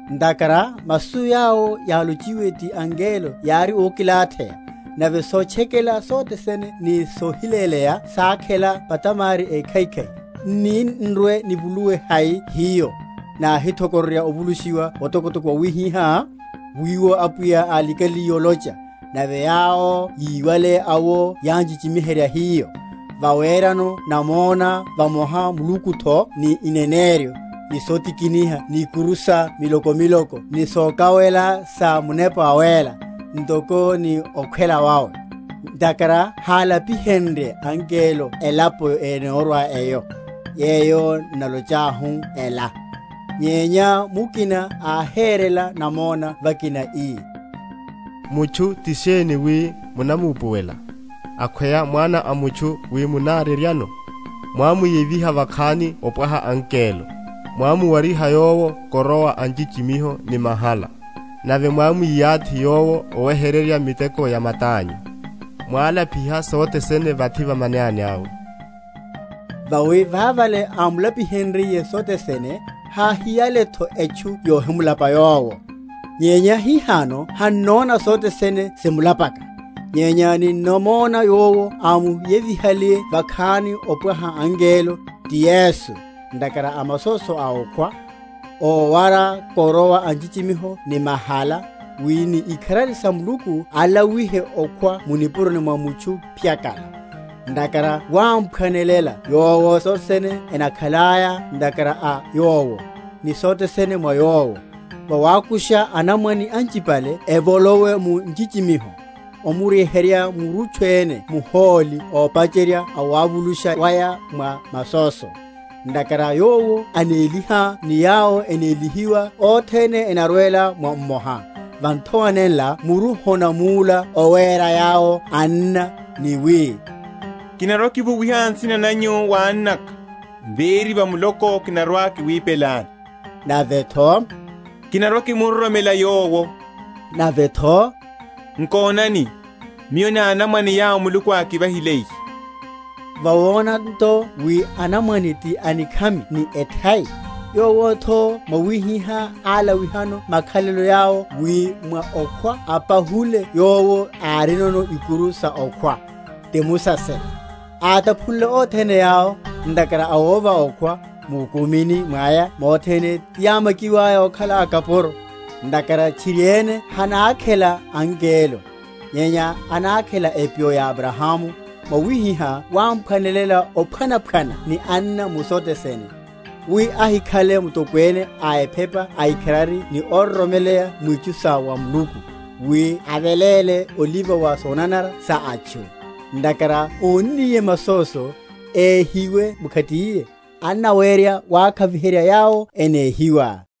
Ntakhara masu yawo yálochiwe ti angelo yári ókilatheya, nave sotchekela sothene ni sohiléleya sákhela phatamari ékhaikhai, nni nrwe‐nivuluwe hai hiyo, nahithokororya ovulushiwa otokotoko wawihihá? wiwo Apwiya álikaliye olocha, nave yawo yíwale awo yánchichimiheryela hiyo; vawerano namona vamoha Mulukutho ni ineneryo, ni sotikiniha ni ikuru sa miloko miloko ni sokawela sa Munepa Wawéla, ntoko ni okhwela wawe. Ntakhara hálapihenrye angelo elapo enorwa eyo, yeyo n’nalochahu ela. Nyenya mukina áherela namona vakina, ii, Mutchu ti sheni wi munamupuwela? Akhweya mwana a mutchu wi munareryano? Mwámuyeviha vakhani opwaha angelo, Mwámuwariha yowo koroa a nchichimiho ni mahala, Nave mwámwiyathi yowo oweherya miteko ya matányu; Mwálapiha sothe sene vathi va manani awe. Vawi vavale ámulapihenryiye sothe sene, háhiyaletho etchu yohimulapa Yowo. Nyenya hihano hannona sothe sene simulapaka. Nyenya ninnamona Yowo ámuyevihale vakhani opwaha angelo, ti Yesu, ntakhara a masóso a okhwa, ówara koroa a nchichimiho ni mahala, wi ni ikharari sa Muluku alawihe okhwa mu nipuroni mwa mutchu phyakala. Ntakhara wámphwanelela Yowo sothe sene enakhalelaya ntakhara a Yowo, ni sothe sene mwa Yowo, vawakusha anamwane anchipale evolowe mu nchichimiho, omuryeherya murutchu ene muhóli ópacherya awavulusha waya mwa masóso. Ntakhara Yowo anéliha ni yawo enélihiwa othene enarwela mwa mmoha; va nthowa nenla muru honamúla owéra yawo anna, ni wi, Kinarwa‐kivuwiha nsina nanyu wa annaka, Véri va muloko kinarwa‐kiwipelani. Navetho, Kinarwa‐kimuroromela Yowo. Navetho, Nkonani, miyo ni anamwane yawo Muluku ákivahiliye. Vawona nto wi anamwane ti anikhami ni ethai, Yowotho mwawihihá álawihano makhalelo yawo wi mwa okhwa ampahule yowo árinono ikuru sa okhwa, ti musaserya; átaphule othene yawo, ntakhara a wova okhwa, mukumini mwaya mothene tiyámakiwaya okhala akapuro. Ntakhara tchiriene hanákhela angelo, nyenya anákhela epyo ya Abrahamu, Mwawihihá wámphwanelela ophwanaphwana ni anna mu sothe sene, wi ahikhale Mutokwene a ephepa aikharari ni óroromeleya mwitchu sa wa Muluku, wi aveléle oliva wa sonanara sa atchu. Ntakhara ónniye masóso, éhiwe mkhatiye, annawerya wakhaviherya yawo enéhiwa.